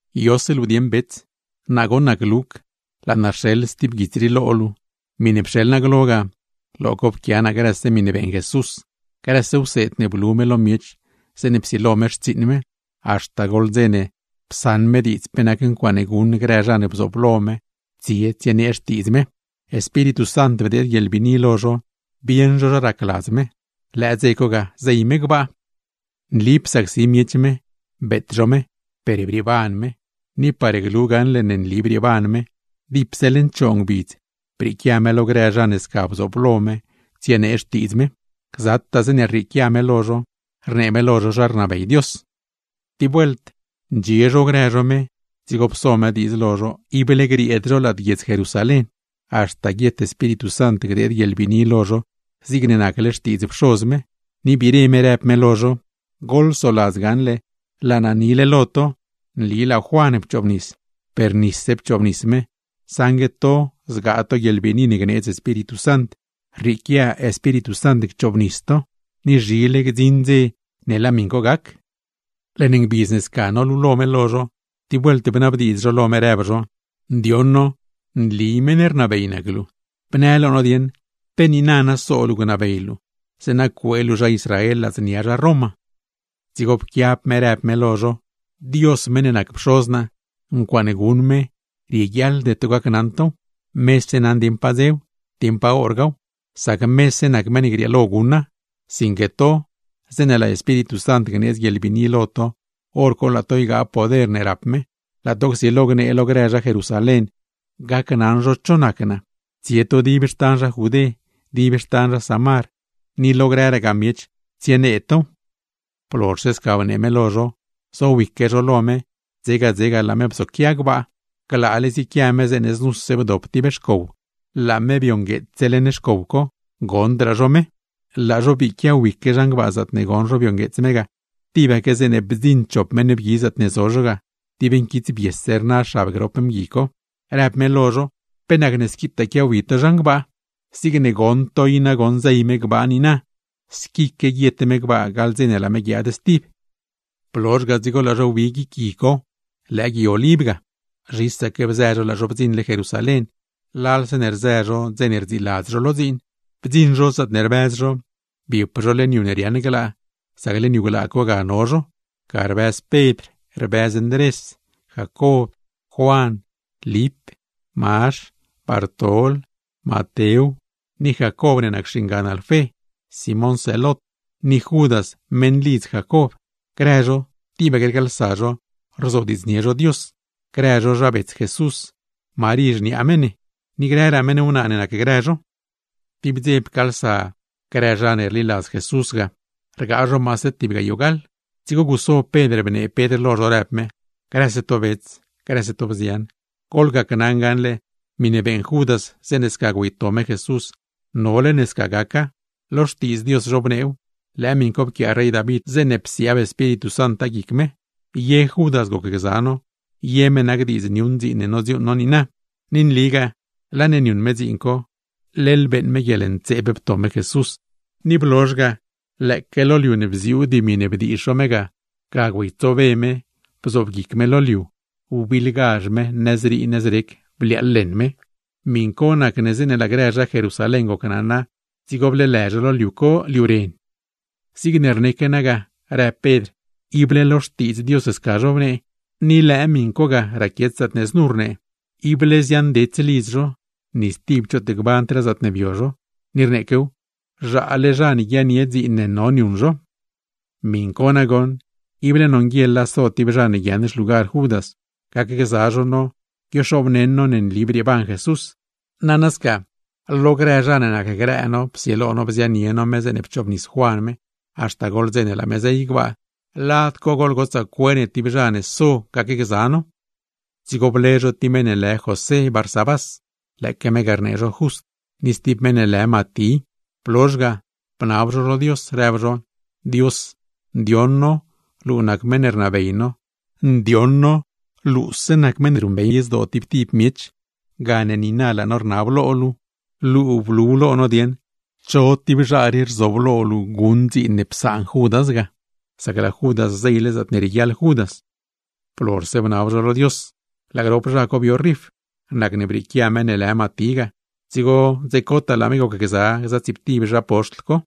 ¿Yose luu dieṉ bets? Naa goṉ nac Luc, laa naa rxeḻ stib guits rii lo luu. Miṉe pxeḻ naa lo luu glo ga, lo co pquia naa grëse miṉe beeṉ Jesús, grëse wseed ne blu me lo miech zeeṉe psilo me xtsiiṉ me haxta goḻ dze ne psaṉ me diidz pe nac ncuaaṉe guṉ grë zha ne bzooblo me tsie tsienee Xtiidz me. Espíritu Sant bdeed guieḻbiini lo zho bieṉ zho zha racladz me; lëë dze co ga zey me gbaa. Nli psacsi miech me, beet zho me, per brieeban me. Ni par glu gaṉle ne nli brieeban me, dipse leṉ choo ngbidz brieequia me lo grë zha ne sca bzooblo me tsienee Xtiidz me. Gzataa zeeṉe rrieequia me lo zho, rnee me lo zho zha rnabey Dios. Tib vuelt ndxie zho grë zho me, dzigo pso me diidz lo zho ible grieed zho lad guiedz Jerusalén, haxta guiet Espíritu Sant gdeed guieḻbiini lo zho zigne nacle xtiidz Pxoz me; ni biire rëb me lo zho: ―Goḻsoladz gaṉle laa naa nile lo to: nli laa Juan pchoobnis, per niab nisa; saṉgue to zgaa to guieḻbiini ne gneedz Espíritu Sant, rrieequia Espíritu co chobnis to; ni zhile gdziṉ dze ne laa miṉ co gac. Leṉ ngbidz ne sca nolulo me lo zho, tib vuelt bnabdiidz zho lo me, rëb zho: ―Ndioṉ no meṉ rnabey nac luu. ¿Pe niina na so luu gnabey luu, zeeṉa cuee luu zha Israel ladznia zha Roma? Dzigo pquiab me rëb me lo zho: ―Dios, meṉ ne nac Pxoz naa, ncuaaṉe guṉ me rieguiaḻde to gacnaṉ tow, mese naṉ dieṉ pa dzew, dieṉ pa horgaaw; sac mese nac meṉ ne grieelo guṉa. Sinque to, zeeṉe laa Espíritu Sant gneedz guieḻbiini lo to, hor co laa to ygaa poder ne rap me, laa to csilo gnee lo grë zha Jerusalén cho nac naa; tsie to dib xtan zha Judé, dib xtan zha Samar, ni lo grëragaa miech, tsienee tow. Blozhse sca bnee me lo zho, zowique zho lo me, dzega, dzega laa me bzoquia gbaa. Glaale ziequia me zeeṉe znuse bdop tib xcow, laa me biongueetsse leṉ xcow co, goṉdraa zho me. Laa zho bii quiawique zhan gbaa zaatne goṉ zho biongueets me ga, tibaque zeeṉe bdziṉ chop mgui zaatne zo zho ga, dib nquitsbiese rna xab grop mgui co; rëb me lo zho: ―¿Pe nacne squitaa quiawi to zhan gbaa? Zigne goṉ to i nagoṉ zey me gbaa niina, squique guiet me gbaa gaḻ dze ne laa me guiaad stib. Blozh ga dzigo laa zho wbi guic gui co (lëë Gui Oliv ga). Zhisaque bzë zho laa zho bdziṉle Jerusalén, lalse ne rzë zho dze ne rdziiladz zho lo dziin. Bdziṉ zho zaatne rbëz zho, biep zho leṉ yu ne riaaṉ glaa; sac leṉ yu glaa co ga no zho. Ga rbëz Pedr, rbëz Ndrés, Jacob, Juan, Lip, Mazh, Bartol, Matew, ni Jacob ne nac xingan Alfé; Simón Zelot, ni Judas meṉlidz Jacob. Grëse zho tibaque rcaalsa zho rzodiidznie zho Dios grë zho zha bets Jesús, xniaa me Marí, ni grëraa meṉ wnaa ne nacgrë zho. Tib dze pcaalsa maase tib gayoo gaḻ zho, dzigo guso Pedr bnee me lo zho, rëb me: ―Grëse to bets, grëse to bzian, goḻgacnaṉ gaṉle, miṉe beeṉ Judas zeeṉe sca güeyto me Jesús, nole ne sca gaca. Lo Xtiidz Dios zhobneew, lëë miṉ co pquiaa rey David zeeṉe psiaab Espíritu Santa guic me. Ye Judas gocgza no, ye me nac diidz niuṉ dziin ne nodziuuṉ no niina. ’Ni nligaa laa ne niuṉ me dziin co, leḻ beeṉ me guieḻntseeb pto me Jesús, ni blozh ga lëëque lo liu ne bziuu dimi ne bdiizh zho me ga, ga güeytsobe me bzob guic me lo liu, wbiḻgazh me, nëzrii nëzrec bliaaḻ leṉ me. Miṉ co nacne zeeṉe laa grë zha Jerusalén gocnaṉa, dzigo bleelë zho liu co “Liu Ren”. ’Zigne rneque naa ga ―rëb Pedr―, ible lo Xtiidz Dios sca zhobnee; ni lëë miṉ co ga raquiet zaatne znu rnee: Ible ziaaṉdets lidz zho, ni stib choot gbandraa zaatne bio zho. Ni rneequew: Zhaale zha ne guiaaṉnie dziin ne no niuṉ zho. ’Miṉ co nagoṉ, ible nonguieḻa so tib zha ne guiaaṉ xlugar Judas, gacgza zho no guioxobneṉ no ne nli brieeban Jesús. Nana sca, lo grë zha ne nacgrë no psilo bzianie no me zeeṉe pchoobnis Juan me, haxta goḻ dze ne laa me zey gbaa, lad co goḻgotsaa cue ne tib zha ne so gacgza no. Dzigo ble zho tib meṉ ne lë José Barsabás (lëëque me ga rnee zho Just), ni stib meṉ ne lë Matí. Blozh ga, bnab zho lo Dios, rëb zho: ―Dios, ndioṉ no luu nac meṉ ne rnabey no; ndioṉ no luuse nac meṉ ne ruṉbey zdoo tib tib miech, gane niina laa no rnab lo luu, luu blu dieṉ cho tib zha rii racladz luu so guṉ dziin ne psaan Judas; sac laa Judas zeyle zaatne rieguiaḻ Judas. Blozhse bnab zho lo Dios, laa grop zha co bio rif. Nacne brieequia meṉ ne lë Matí ga, dzigo dze cotaa laa me gocgza stsiiptib zha poxtl co.